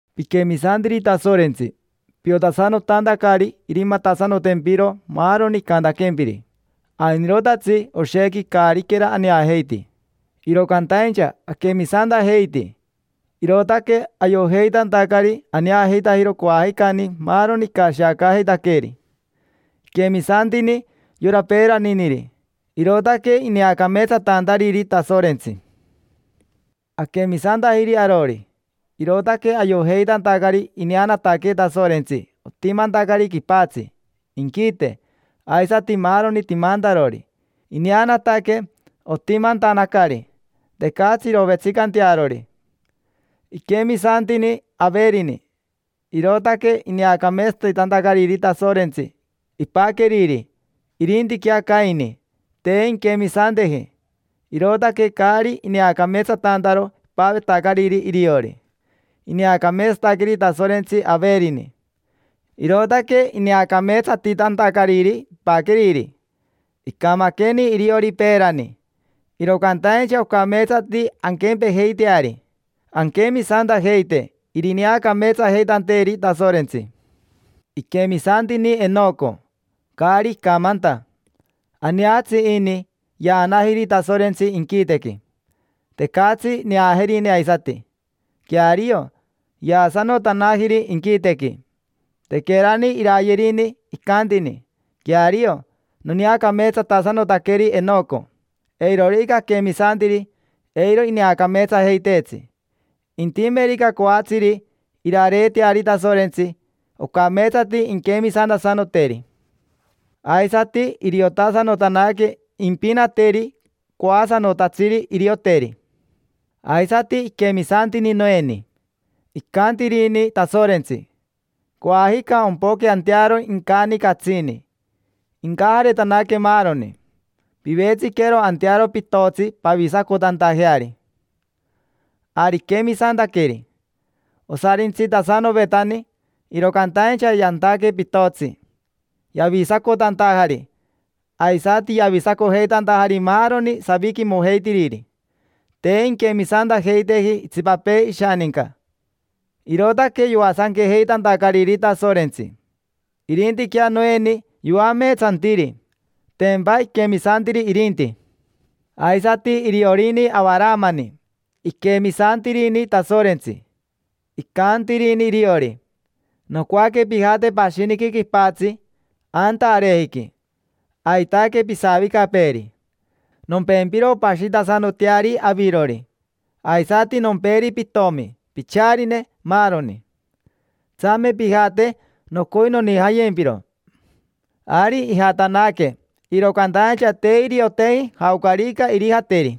Piquemisantiri Tasorentsi piotasanotantacari irimatasanotempiro maaroni icantaquempiri. Ainirotatsi oshequi caariquera aneajeiti, iro cantaincha aquemisantajeiti, irootaque ayojeitantacari aneajeitajero coajicani maaroni icashiacaajeitaqueeri. Iquemisantini yora peeraniniri, irootaque ineacameetsatantariri Tasorentsi. Aquemisantajiri arori, irootaque ayojeitantacari ineanataque Tasorentsi otimantacari quipatsi, inquite, aisati maaroni timantarori. Ineanataque otimantanacari: tecatsi irovetsicantearori. Iquemisantini Averini, irootaque ineacameetsatitantacariri Tasorentsi ipaqueriri; irintiquea Caini, te inquemisanteji, irootaque caari ineacameetsatantaro ipavetacariri iriori. Ineacameetsataqueri Tasorentsi Averini, irootaque ineacameetsatitantacariri ipaqueriri. Icamaqueni iriori peerani, iro cantaincha ocameetsati anquempejeiteari: anquemisantajeite irineacameetsajeitanteeri Tasorentsi. Iquemisantini Enoco, caari icamanta. Aneatsi ini, yaanajiri Tasorentsi inquitequi. Tecatsi neajerine aisati: queario, yaasanotanajiri inquitequi. Tequerani iraayerini, icantini: “Queario, noneacameetsatasanotaqueri Enoco”. Eirorica aquemisantiri, eiro ineacameetsajeiteetsi. Intimerica coatsiri irareeteari Tasorentsi, ocameetsati inquemisantasanoteri, aisati iriotasanotanaque impinateri coasanotatsiri irioteri. Aisati iquemisantini Noeni. Icantirini Tasorentsi: “Coajica ompoque antearo incani catsini, incajaretanaque maaroni. Pivetsiquero antearo pitotsi pavisacotantajeari”. Ari iquemisantaqueri. Osarintsitasanovetani, iro cantaincha yantaque pitotsi, yavisacotantajari, aisati yavisacojeitantajari maaroni saviquimojeitiriri. Te inquemisantajeiteji itsipapee ishaninca, irootaque yoasanquejeitantacariri Tasorentsi. Irintiquea Noeni yoameetsantiri: tempa iquemisantiri irinti. Aisati iriorini Avaramani, iquemisantirini Tasorentsi. Icantirini iriori: “Nocoaque pijate pashiniqui quipatsi, anta arejiqui: aitaque pisavicapeeri. Nompempiro pashitasanoteari avirori; aisati nomperi pitomi, picharine, maaroni. Tsame pijate, nocoi nonijayempiro”. Ari ijatanaque, iro cantaincha te irioteji jaocarica irijateri.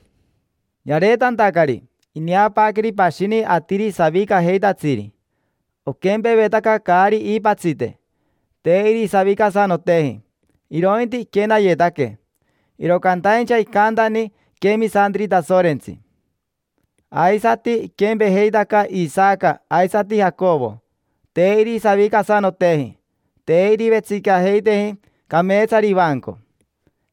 Yareetantacari, ineapaaqueri pashini atiri savicajeitatsiri. Oquempevetaca caari iipatsite, te irisavicasanoteji, irointi iquenayetaque; iro cantaincha icantani iquemisantiri Tasorentsi. Aisati iquempejeitaca Isaca aisati Jacovo: te irisavicasanoteji, te irivetsicajeiteji cameetsari ivanco,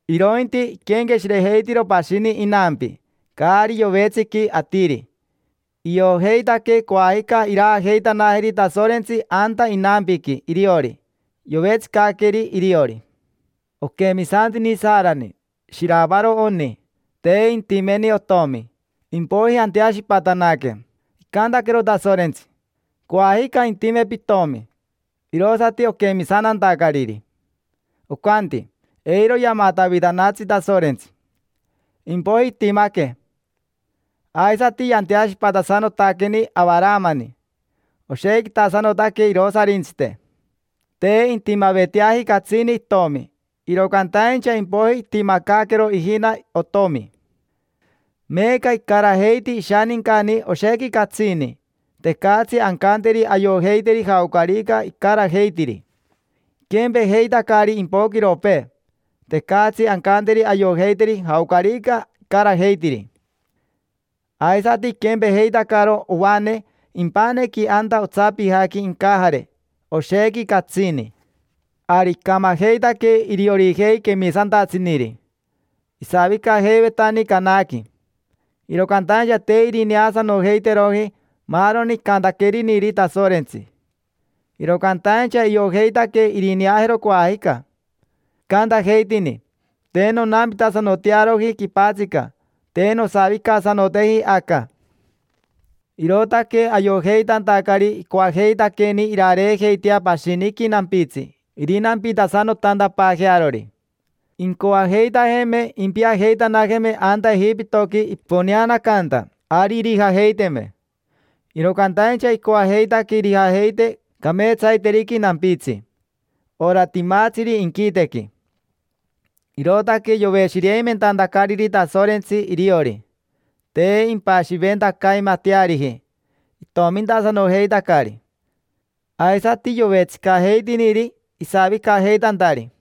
irointi iquenqueshirejeitiro pashini inampi, caari yovetsiqui atiri. Iojeitaque coajica iraajeitanajeri Tasorentsi anta inampiqui iriori, yovetsicaqueri iriori. Oquemisantini Sarani: shiravaro oni, te intimeni otomi. Impoiji anteashipatanaque. Icantaquero Tasorentsi: “Coajica intime pitomi”, irosati oquemisantantacariri. Ocanti: “Eiro yamatavitanatsi Tasorentsi”. Impoiji itimaque. Aisati yanteashipatasanotaqueni Avaramani, oshequitasanotaque irosarintsite. Te intimaveteaji catsini itomi, iro cantaincha impoiji itimacaaquero ijina otomi. Meeca icarajeiti ishanincani oshequi catsini, tecatsi ancanteri ayojeiteri jaocarica icarajeitiri: iquempejeitacari impoquiropee, tecatsi ancanteri ayojeiteri jaocarica icarajeitiri. Aisati iquempejeitacaro ovane impanequi anta otsapijaqui incajare, oshequi catsini. Ari icamajeitaque iriorijei quemisantatsiniri: isavicajeivetani Canaqui, iro cantaincha te irineasanojeiteroji maaroni icantaqueriniri Tasorentsi. Iro cantaincha iojeitaque irineajero coajica. Icantajeitini: “Te nonampitasanotearoji quipatsica, te nosavicasanoteji aca”. Irootaque ayojeitantacari icoajeitaqueni irareejeitea pashiniqui nampitsi irinampitasanotantapaajearori. Incoajeitajeme impiajeitanajeme anta Ejipitoqui iponeantacari, ari irijajeiteme. Iro cantaincha icoajeitaque irijajeite cameetsaiteriqui nampitsi: ora timatsiri inquitequi. Irootaque yoveshireimentantacariri Tasorentsi iriori: te impashiventacaimateariji, itomintasanojeitacari. Aisati yovetsicajeitiniri isavicajeitantari.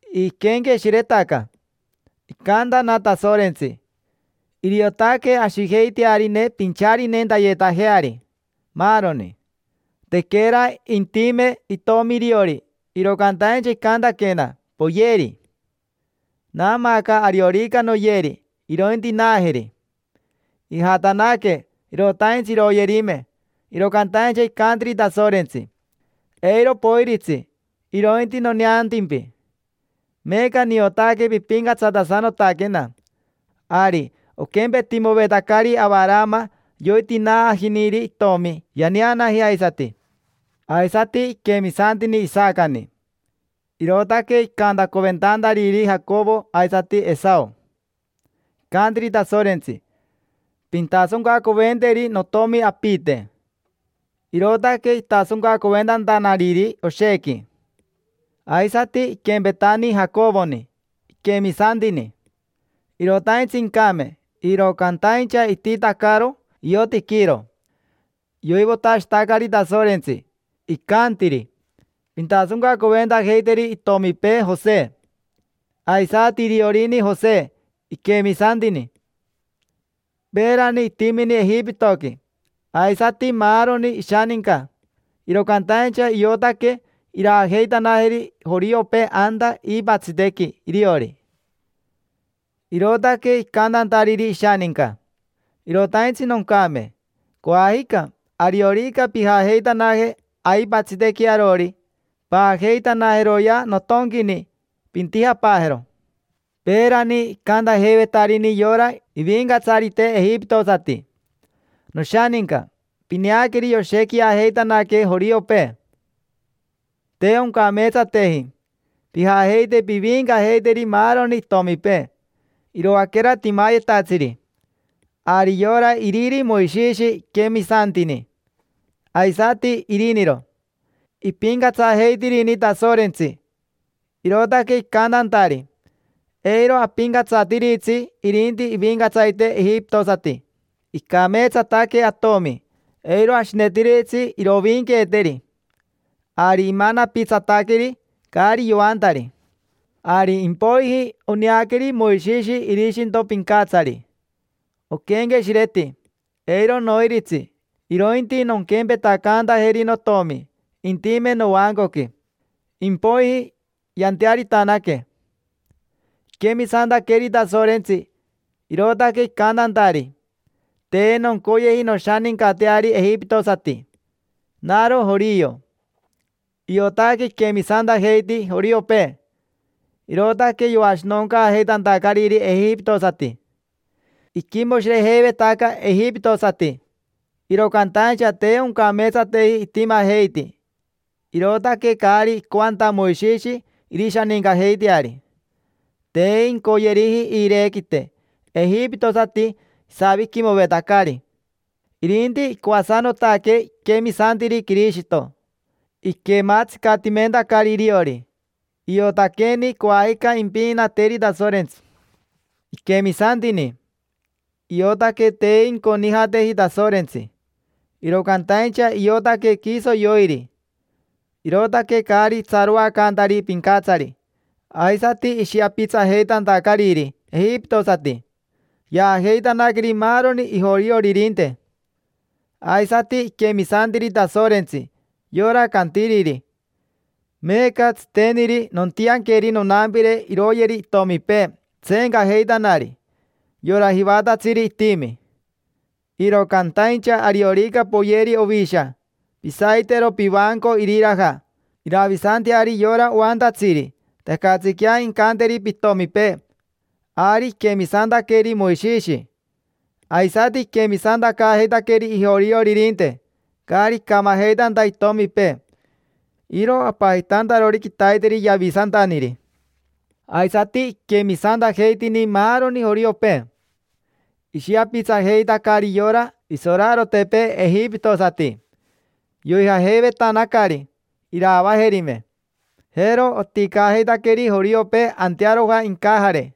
Iquenqueshiretaca: “Icantana Tasorentsi: ‘Iriotaque ashijeitearine pincharinentayetajeari, maaroni’. Tequera intime itomi iriori, iro cantaincha icantaquena: ‘Poyeri’. Naamaaca ariorica noyeri, irointinaajeri”. Ijatanaque, irotaintsi iroyerime, iro cantaincha icantiri Tasorentsi: “Eiro poiritsi, irointi noneantimpi. Meeca niotaque pipincatsatasanotaquena”. Ari oquempetimovetacari Avarama yoitinaajiniri itomi, yaneanaji aisati. Aisati iquemisantini Isacani, irootaque icantacoventantariri Jacovo aisati Esao. Icantiri Tasorentsi: “Pintasoncacoventeri notomi apite”. Irootaque itasoncacoventantanariri oshequi. Aisati iquempetani Jacovoni, iquemisantini. Irotaintsi incame, iro cantaincha ititacaro iotiquiiro; yoivotashitacari Tasorentsi, icantiri: “Pintasoncacoventajeiteri itomipee Jose”. Aisati iriorini Jose, iquemisantini. Peerani itimini Ejipitoqui, aisati maaroni ishaninca, iro cantaincha iotaque iraajeitanajeri joriopee anta iipatsitequi iriori. Irootaque icantantariri ishaninca: “Irotaintsi noncame. Coajica, ariorica pijajeitanaje aipatsitequi arori, paajeitanajeroyea notonquini, pintijapaajero”. Peerani icantajeivetarini yora ivincatsarite ejipitosati: “Noshaninca, pineaqueri yoshequiajeitanaque joriopee: te oncameetsateji. Pijajeite piviincajeiteri maaroni itomipee, iroaquera timayetatsiri”. Ari yora iriri Moishishi iquemisantini, aisati iriniro: ipincatsajeitirini Tasorentsi, irootaque icantantari: “Eiro apincatsatiritsi irinti ivincatsarite ejipitosati. Icameetsataque atomi, eiro ashinetiritsi iroviinquiteeri”. Ari imanapitsataqueri, caari yoantari. Ari impoiji oneaqueri Moishishi irishinto pincatsari. Oquenqueshireti: “Eiro noiritsi, irointi nonquempetacantajeri notomi, intime novancoqui”. Impoiji yantearitanaque. Iquemisantaqueri Tasorentsi, irootaque icantantari: “Te noncoyeji noshanincateari ejipitosati, naro jorio”. Iotaque iquemisantajeiti joriopee, irootaque yoashinoncaajeitantacariri ejipitosati. Iquimoshirejeivetaca ejipitosati, iro cantaincha te oncameetsateji itimajeiti, irootaque caari icoanta Moishishi irishanincajeiteari. Te incoyeriji iirequite ejipitosati isaviquimovetacari, irinti icoasanotaque iquemisantiri Quirishito, iquematsicatimentacari iriori. Iotaqueni coajica impinateri Tasorentsi. Iquemisantini, iotaque te inconijateji Tasorentsi, iro cantaincha iotaque quiso yoiri; irootaque caari itsaroacantari pincatsari, aisati ishiapitsajeitantacariri ejipitosati, yaajeitanaqueri maaroni ijorioririnte. Aisati iquemisantiri Tasorentsi, yora cantiriri: “Meeca tsiteniri nontianqueri nonampire iroyeri itomipee tseencajeitanari, yora jivatatsiri itimi. Iro cantaincha ariorica poyeri ovisha, pisaitero pivanco iriraja, iravisanteari yora oantatsiri, tecatsiquea incanteri pitomipee”. Ari iquemisantaqueri Moishishi, aisati iquemisantacaajeitaqueri ijorioririnte, caari icamajeitanta itomipee. Iro apajitantarori quitaiteri: “Yavisantaniri”. Aisati iquemisantajeitini maaroni joriopee. Ishiapitsajeitacari yora isorarotepee ejipitosati. Yoijajeivetanacari, iraavajerime. Jero oticajeitaqueri joriopee antearoja incajare,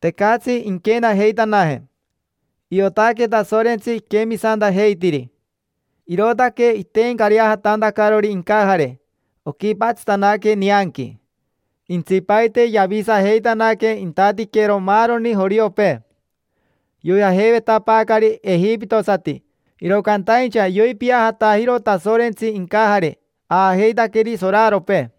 tecatsi inquenajeitanaje. Iotaque Tasorentsi iquemisantajeitiri, irootaque iteencareajatantacarori incajare, oquipatsitanaque nianqui. Jentsipaite yavisajeitanaque intatiquero maaroni joriopee. Yoijajeivetapaacari ejipitosati, iro cantaincha yoipiajatajiro Tasorentsi incajare, aajeitaqueri soraropee.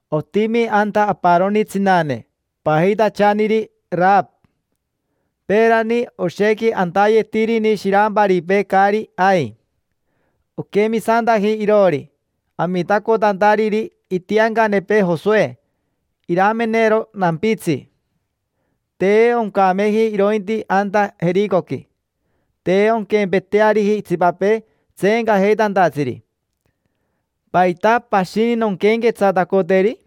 Otimi anta aparoni tsinane, pajitachaniri Arava. Peerani oshequi antayetirini shiramparipee caari ai. Oquemisantaji iroori, amitacotantariri itiancanepee Josoe iramenero nampitsi. Te oncameji irointi anta Jericoqui, te onquempeteariji itsipapee tseencajeitantatsiri. ¿Paita pashini nonquenquetsatacoteri?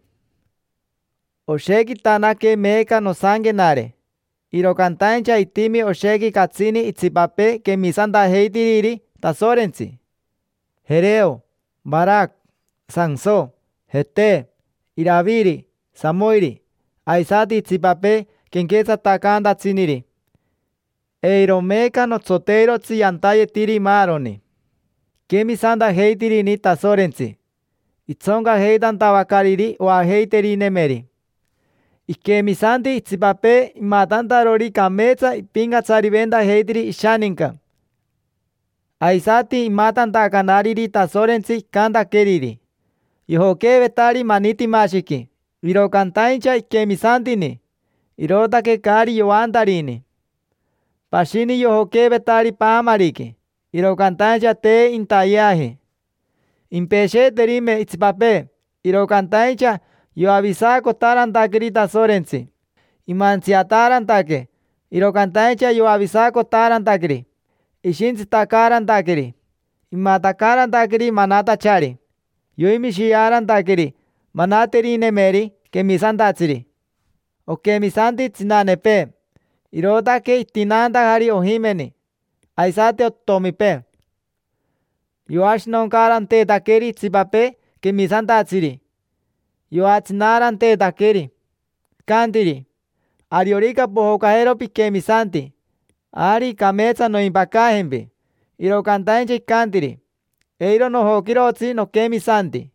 Oshequitanaque meeca nosanquenare, iro cantaincha itimi oshequi catsini itsipapee quemisantajeitiriri Tasorentsi: Quereo, Varaca, Santso, Jete, Iraviri, Samoiri, aisati itsipapee quenquetsatacantatsiniri. Eiro meeca notsoteirotsi yantayetiri maaroni. Iquemisantajeitirini Tasorentsi, itsoncajeitantavacariri oajeiterinemeri. Iquemisanti itsipapee imatantarori cameetsa ipincatsariventajeitiri ishaninca, aisati imatantacanariri Tasorentsi icantaqueriri. Yojoqueevetari manitimashiqui, iro cantaincha iquemisantini, irootaque caari yoantarini. Pashini yojoqueevetari paamariqui, iro cantaincha te intayeaji. Impesheeterime itsipapee, iro cantaincha yoavisacotaarantaqueri Tasorentsi. Imantsiataarantaque, iro cantaincha yoavisacotaarantaqueri, ishintsitacaarantaqueri. Imatacaarantaqueri manatachari. Yoimishiaarantaqueri manaterinemeri quemisantatsiri. Oquemisanti tsinanepee, irootaque itinaantajari ojimeni, aisati otomipee. Yoashinoncaaranteetaqueri itsipapee quemisantatsiri, yoatsinaaranteetaqueri; icantiri: “Ariorica pojocajero piquemisanti, ari cameetsa noimpacajempi”. Iro cantaincha icantiri: “Eiro nojoquirotsi noquemisanti.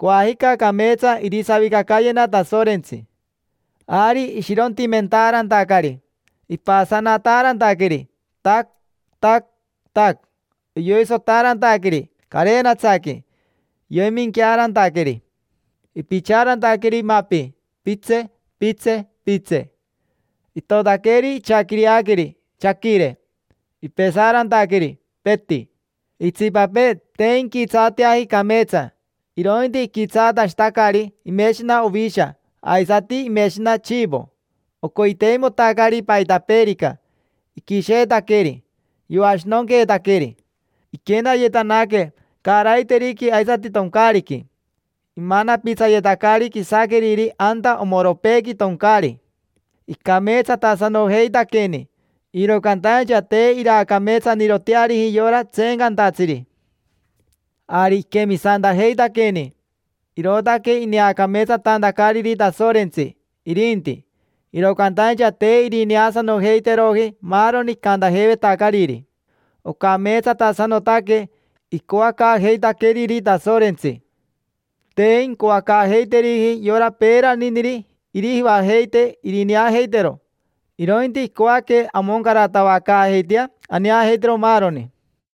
Coajica cameetsa irisavicacayena Tasorentsi”. Ari ishirontimentaarantacari, ipasanataarantaqueri, tac, tac, tac; yoisotaarantaqueri carenatsaqui, yoiminquiaarantaqueri, ipichaarantaqueri mapi, pitse, pitse, pitse. Itotaqueri ichaquireaqueri, chaquire. Ipesaarantaqueri, peti. Itsipapee te inquitsaateaji cameetsa, irointi iquitsaatashitacari imeshina ovisha aisati imeshina chivo; ocoiteimotacari paitapeerica, iquisheetaqueri, yoashinonqueetaqueri. Iquenayetanaque caaraiteriqui aisati toncaariqui. Imanapitsayetacari quisaqueriri anta omoropeequi toncaari. Icameetsatasanojeitaqueni, iro cantaincha te iraacameetsaniroteariji yora tseencantatsiri. Ari iquemisantajeitaqueni, irootaque ineacameetsatantacariri Tasorentsi, irinti; iro cantaincha te irineasanojeiteroji maaroni icantajeivetacariri. Ocameetsatasanotaque icoacaajeitaqueeri Tasorentsi: te incoacaajeiteriji yora peeraniniri irijivajeitee irineajeitero, irointi icoaque amoncaratavacaajeitea aneajeitero maaroni.